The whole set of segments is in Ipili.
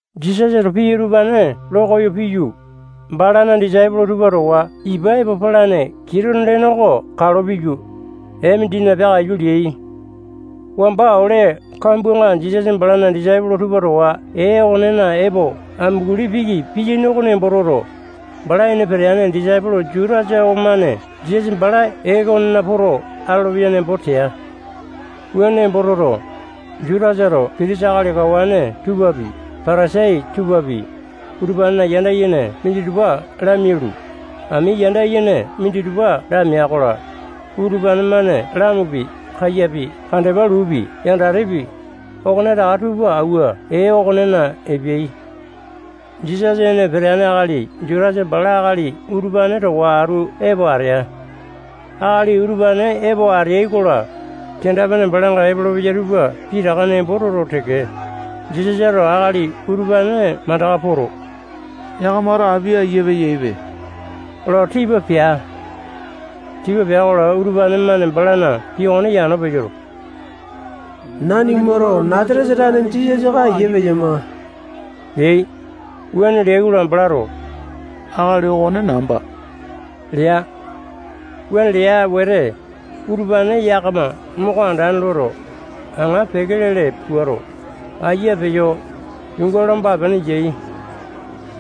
Jisasato pii utupane lo koyo piyu, balana disaipolo tupa towa ipa epo palane Kitone lene oko kalo piyu, ee mindina peakaiyu leai. Wamba ole kambuanga Jisasa balana disaipolo tupa towa ee okonena epo amunguli piki piyaini oko nembo toto, bala ene peteane disaipolo Jutasa okomane Jisasa bala ee okonena poto atolopeya nembo tea. Wuane nembo toto, Jutasato pitisa akali kawane tupapi, Patasai tupapi, utupanena yanda yene minditupa lamialu, ami yanda yene minditupa lamea-kola, utupane-mane lamupi, kaiyapi, kandepa luupi, yandatepi, okonetaka tupa awua ee okonena epeai. Jisasa ene peteane akali Jutasa bala akali utupane towa atu epo atea. Akali utupane epo ateai-kola, kenda-pene balanga epolopeyai tupa pitaka nembo toto teke, Jisasato akali utupane mandaka poto, yakamato api ayia peyaipe lo tipa pea. Tipa pea-kola, utupane-mane balana pii okone yano peyoto, nanimato Nasatesa tane Jisasa oko ayia peyama leai. Wuane leai-kola, balato akali okone namba lea. Wuane lea wete, utupane yakama moko andane loto, aŋa peke lele puato, ayia peyo, yuunga lomba-pene yai.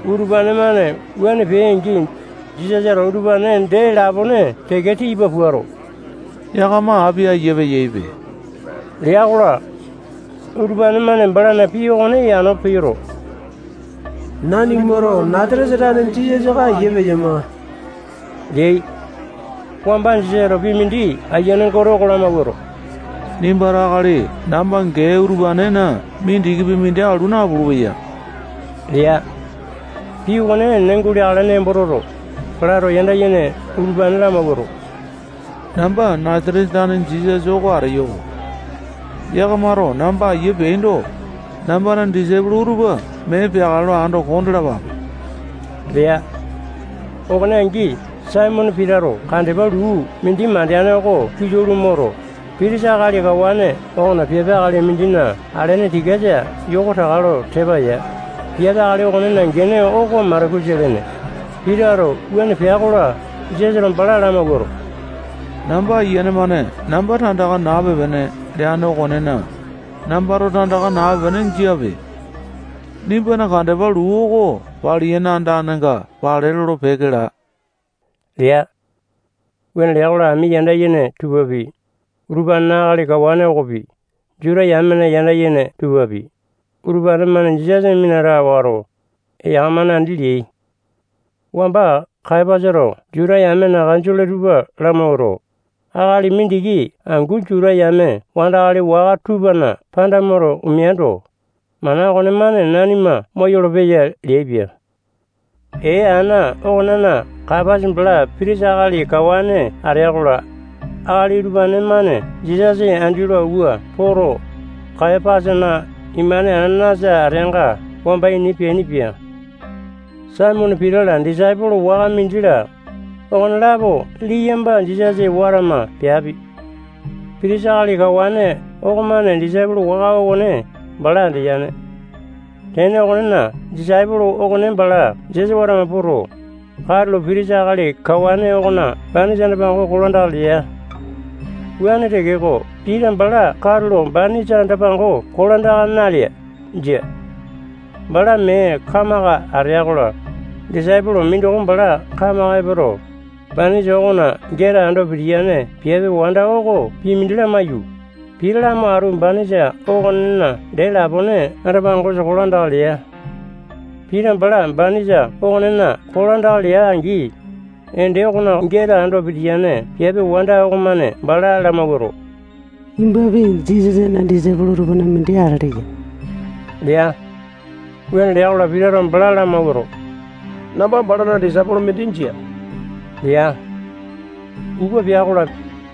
Utupane-mane wuane peai-angi, Jisasato utupane dee lapone teke tipa puato, yakama api ayia peyaipe lea-kola, utupane-mane balana pii okone yano peyoto, nanimato Nasatesa tane Jisasa oko ayia peyama leai. Wamba Jisasato pii mindi Ayiane Gote oko lamawuato, nimbato akali namba gee utupanena mindikipi mindi alu napulu-peya lea. Pii okone enene guleakale nembo toto, balato yanda yene utupane lamawuato, namba Nasatesa tane Jisasa oko ateyo-ko. Yakamato namba ayia peaindo, nambana disaipolo utupa mee peakale lo ando kondalapape lea. Okone angi, Saimone Pitato kandepa luu mindi mandeane okone kilau lo moto, pitisa akali kawane okona piape akali mindina alene tikasa yoko taka lo tepa ya. Piape akali okonena gene oko Malakusa lene. Pitato wuane pea-kola, Jisasato bala lamawuato, namba Ayiane-mane namba tandaka nape-pene leane okonena, nambato tandaka nape-pene jiape. Nimbana kandepa luu oko paliyane andanenga pale lolo-peke laa lea. Wuane lea-kola, ami yanda yene tupapi, utupanena akali kawane okopi, Juta yamena yanda yene tupapi, utupane-mane Jisasa minata wato, eyaka-mane andi leai. Wamba Kayapasato Juta yamena kanjole tupa lamawuato, akali mindiki angu Juta yame wandakali waka tupana panda moto omeando, mana okonemane nanima moyolo-peya leaipia. Ee ana okonena Kayapasa bala pitisa akali kawane atea-kola, akali utupane-mane Jisasa andi lo awua poto, Kayapasana imane Anasa ateanga wamba ini peainipia. Saimone Pita-la, disaipolo waka mindi-la, okonelapo liyamba Jisasa watama peapi. Pitisa akali kawane okomane disaipolo waka okone bala andeyane. Tene okonena, disaipolo okone bala Jisasa watama poto, katulo pitisa akali kawane okona banisa anda-pango kolandaka lea. Wuane tekeko, Pita bala katulo banisa anda-pango kolandaka nalea. Jia. Bala mee kamaka atea-kola, disaipolo mindoko bala kamaka epoto, banisa okona geta ando pitiyane piape wanda oko pii mindi lamaiyu, Pita lamo atu banisa okonena dee lapone anda-pangosa kolandaka lea. Pita bala banisa okonena kolandaka lea-angi, ende okona geta ando pitiyane piape wanda okonemane bala lamawuato, nimbapi Jisasana disaipolo tupana mindi atele ya lea. Wuane lea-kola, Pitato bala lamawuato, namba balana disaipolo mindi jia lea. Upa pea-kola,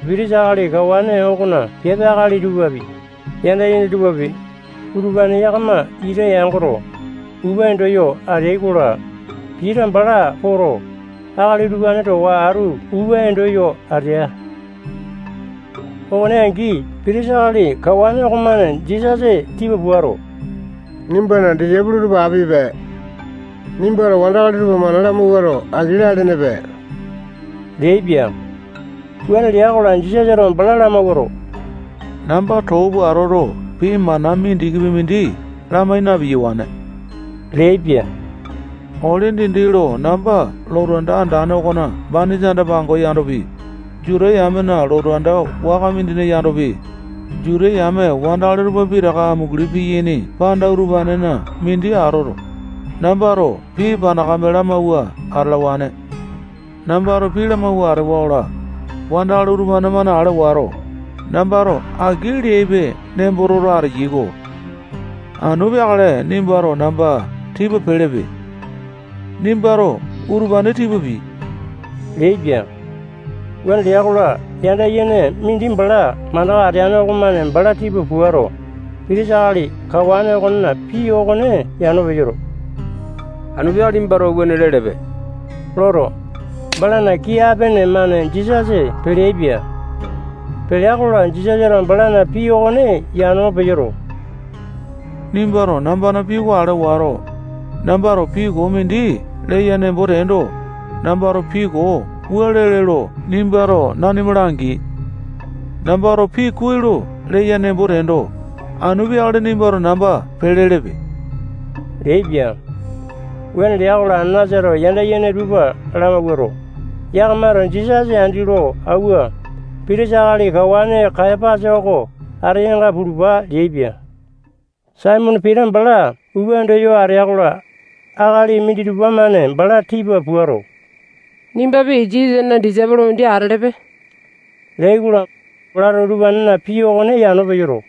pitisa akali kawane okona piape akali tupapi, yanda yene tupapi, utupane yakama ita yangoto, upa endo yo ateai-kola, Pita bala poto, akali utupane towa atu upa endo yo atea. Okone angi, pitisa akali kawane okomane Jisasa tipa puato, nimbana disaipolo tupa apipe. Nimbato wandakali tupa mana lamawuato, aki lalenepe leaipia. Wuane lea-kola, Jisasato bala lamawuato, namba too pua atoto, pii mana mindikipi mindi lamai na-piyawane leaipia. Ole dindi lo namba lotu anda andane okona banisa anda-pango yandopi, Juta yamena lotu anda waka mindina yandopi, Juta yame wandakali tupa pitaka amunguli piyaini panda utupanena mindi atoto, nambato pii panakame lamauwa atalawane. Nambato pii lamawua atewa-kola, wandakali utupane-mane ale wato, nambato aki leape nemboto ateyai-ko. Anu peakale nimbato namba tipa pelepe. Nimbato utupane tipa pii leaipia. Wuane lea-kola, yanda yene mindi bala mandaka ateane okomane bala tipa puato, Pitisa akali kawane okona pii okone yano peyoto, anu peakale nimbato wuane lelepe loto, balana kii apene-mane Jisasa peleaipia. Pelea-kola, Jisasato balana pii okone yano peyoto, nimbato nambana pii ale wato, nambato pii koo mindi leya nembo teendo, nambato pii koo wua lele lo nimbato nanima langi. Nambato pii kuai lo leya nembo teendo, anu peakale nimbato namba pelelepe leaipia. Wuane lea-kola, Anasato yanda yene tupa lamawuato, yakamato Jisasa andi lo awua, pitisa akali kawane Kayapasa oko ateyanga pulupa leaipia. Saimone Pita bala upa endo yo atea-kola, akali minditupa-mane bala tipa puato, nimbapi Jisasana disaipolo mindi atelepe leai-kola, balato utupanena pii okone yano peyoto,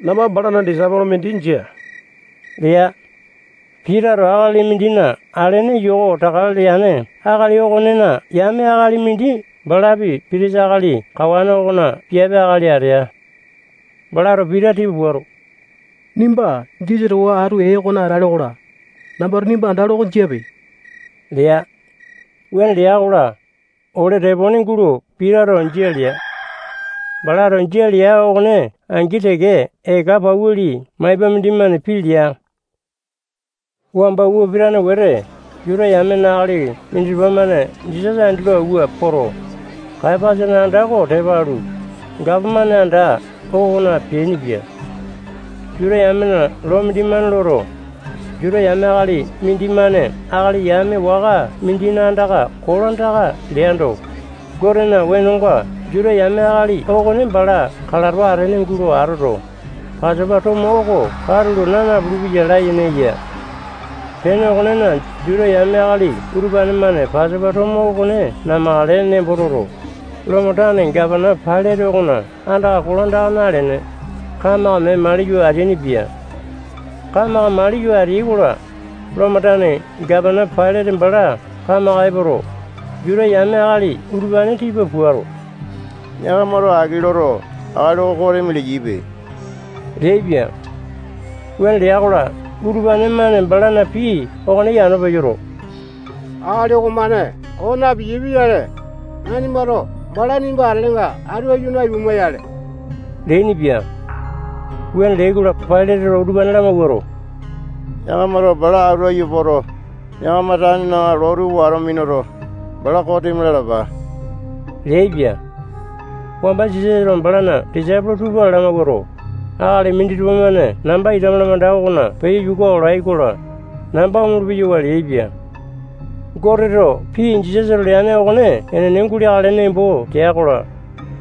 namba balana disaipolo mindi jia lea. Pitato akali mindina alene yoko taka leane akali okonena yame akali mindi balapi pitisa akali kawane okona piape akali atea. Balato Pita tipa puato, nimba Jisasa towa atu ee okona atale-kola, nambato nimba andalo oko jiape lea. Wuane lea-kola, ole tepone gulo Pitato jia lea. Balato jia lea okone angi teke eka pauli maipa mindimane pii lea. Wamba upa pitane wete, Juta yamena akali minditupa-mane Jisasa andi lo awua poto, Kayapasana anda oko tepa alu, gapomane anda okona peainipia. Juta yamena loo mindimane loto, Juta yame akali mindimane akali yame waka mindina andaka kolandaka leando, Gotena wenonga Juta yame akali okone bala kalato atene gulo atoto, Pasopa tomo oko katulo naa napulu-peya layene yene. Tene okonena, Juta yame akali utupane-mane Pasopa tomo okone namakale nembo toto, Lomo tane gapana Pailate okona andaka kolandaka nalene, kamaka mee maliyo ateainipia. Kamaka maliyo ateai-kola, Lomo tane gapana Pailate bala kamaka epoto, Juta yame akali utupane tipa puato, yakamato aki loto, akali oko kosimi leyaipe leaipia. Wuane lea-kola, utupane-mane balana pii okone yano peyoto, akali okomane koo napiyae pia-yale, nanimato bala nimba atelenga atu aiyu naipuma-yale leainipia. Wuane leai-kola, Pailateto utupane lamawuato, yakamato bala atu aiyu poto, yakama tanena loo tupa wato minuto, bala kosimi lalapa leaipia. Wamba Jisasato balana disaipolo tupa lamawuato, akali minditupa-mane namba ita malamanda okona peyo yuka olai-kola, namba omolopeyo leaipia. Goteto pii Jisasato leane okone enene guleakale nembo tea-kola,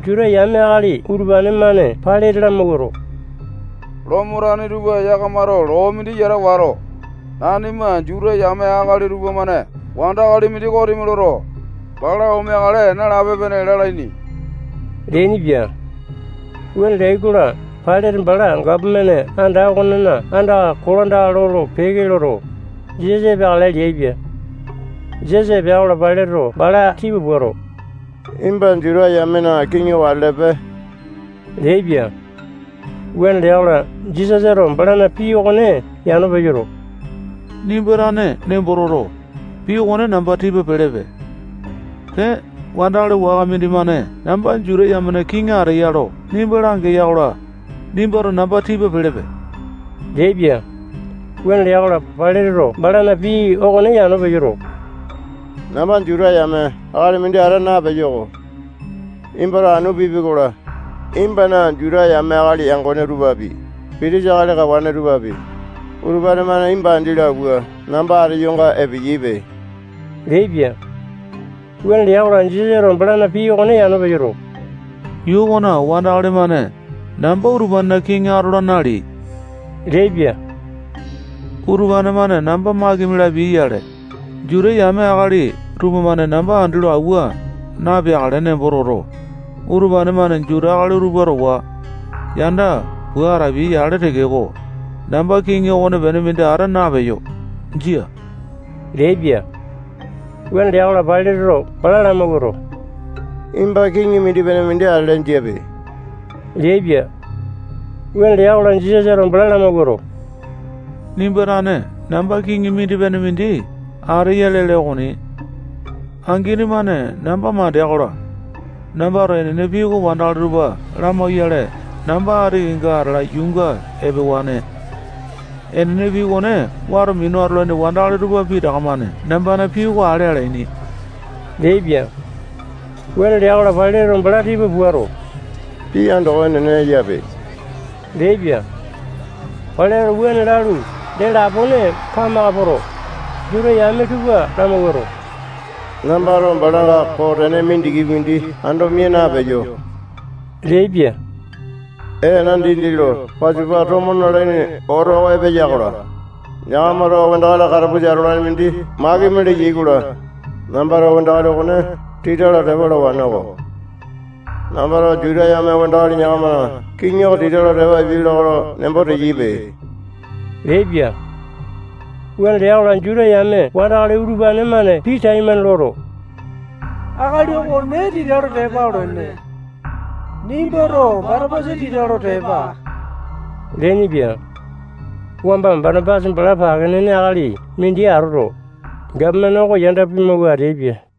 Juta yame akali utupane-mane Pailate lamawuato, Lomo tane tupa yakamato loo mindi yata wato, nanima Juta yame akali tupamane wandakali mindi kosimi loto, bala omeakale nalape-pene lalaini leainipia. Wuane leai-kola, Pailate bala gapomane anda okonena andaka kolandaka lolo-peke loto, Jisasa epeakale leaipia. Jisasa epea-kola, Pailateto bala tipa puato, nimba Juta yamena kiŋi oko atelepe leaipia. Wuane lea-kola, Jisasato balana pii okone yano peyoto, nimba tane nembo toto, pii okone namba tipa pelepe. Pee, wandakali waka mindimane namba Juta yamena kiŋi ateya lo nimba langeya-kola, nimbato namba tipa pelepe leaipia. Wuane lea-kola, Pailateto balana pii okone yano peyoto, namba Juta yame akali mindi ata napeyo-ko. Nimbato anu pipi-kola, nimbana Juta yame akali yangone tupapi, pitisa akali kawane tupapi, utupane-mane nimba andi lo awua namba ateyonga epeyaipe leaipia. Wuane lea-kola, Jisasato balana pii okone yano peyoto, yuu okona wandakali-mane namba utupanena kiŋi atola naleai leaipia. Utupane-mane namba makimi lapiai-yale, Juta yame akali tupamane namba andi lo awua na-epeakale nembo toto, utupane-mane Juta akali utupa towa yanda pua atapiai-yale tekeko, namba kiŋi okonepene mindi ata napeyo. Jia leaipia. Wuane lea-kola, Pailateto bala lamawuato, nimba kiŋi mindi-pene mindi atele jiape leaipia. Wuane lea-kola, Jisasato bala lamawuato, nimba tane namba kiŋi mindi-pene mindi ateya lele okoni. Angini-mane namba mandea-kola, nambato enene pii oko wandakali tupa lamauyale namba ati kenga atala yuunga epewane. Enene pii okone wato minu atalaini wandakali tupa pitaka-mane nambana pii oko ale alaini leaipia. Wuane lea-kola, Pailateto bala tipa puato, pii andoko enene eyape leaipia. Pailateto wuane lalu, dee lapone kamaka poto, Juta yame tupa lamawuato, nambato balanga koo tene mindikipi mindi ando mia napeyo leaipia. Ee ana dindi lo Pasopa tomo nalaini oto oko epeya-kola, yakamato wandakali katapusa atolane mindi makimi leyai-kola, nambato wandakali okone tita lo tepa alawane-ko. Nambato Juta yame wandakali yakamana kiŋi oko tita lo tepa apia lakae lo nembo teyaipe leaipia. Wuane lea-kola, Juta yame wandakali utupane-mane pii taimane loto, akali okone tita lo tepa olene. Nimbato Batapasa tita lo tepa aa leainipia. Wamba Batapasa bala pake nene akali mindi atoto, gapomane oko yanda pimawua ateaipia.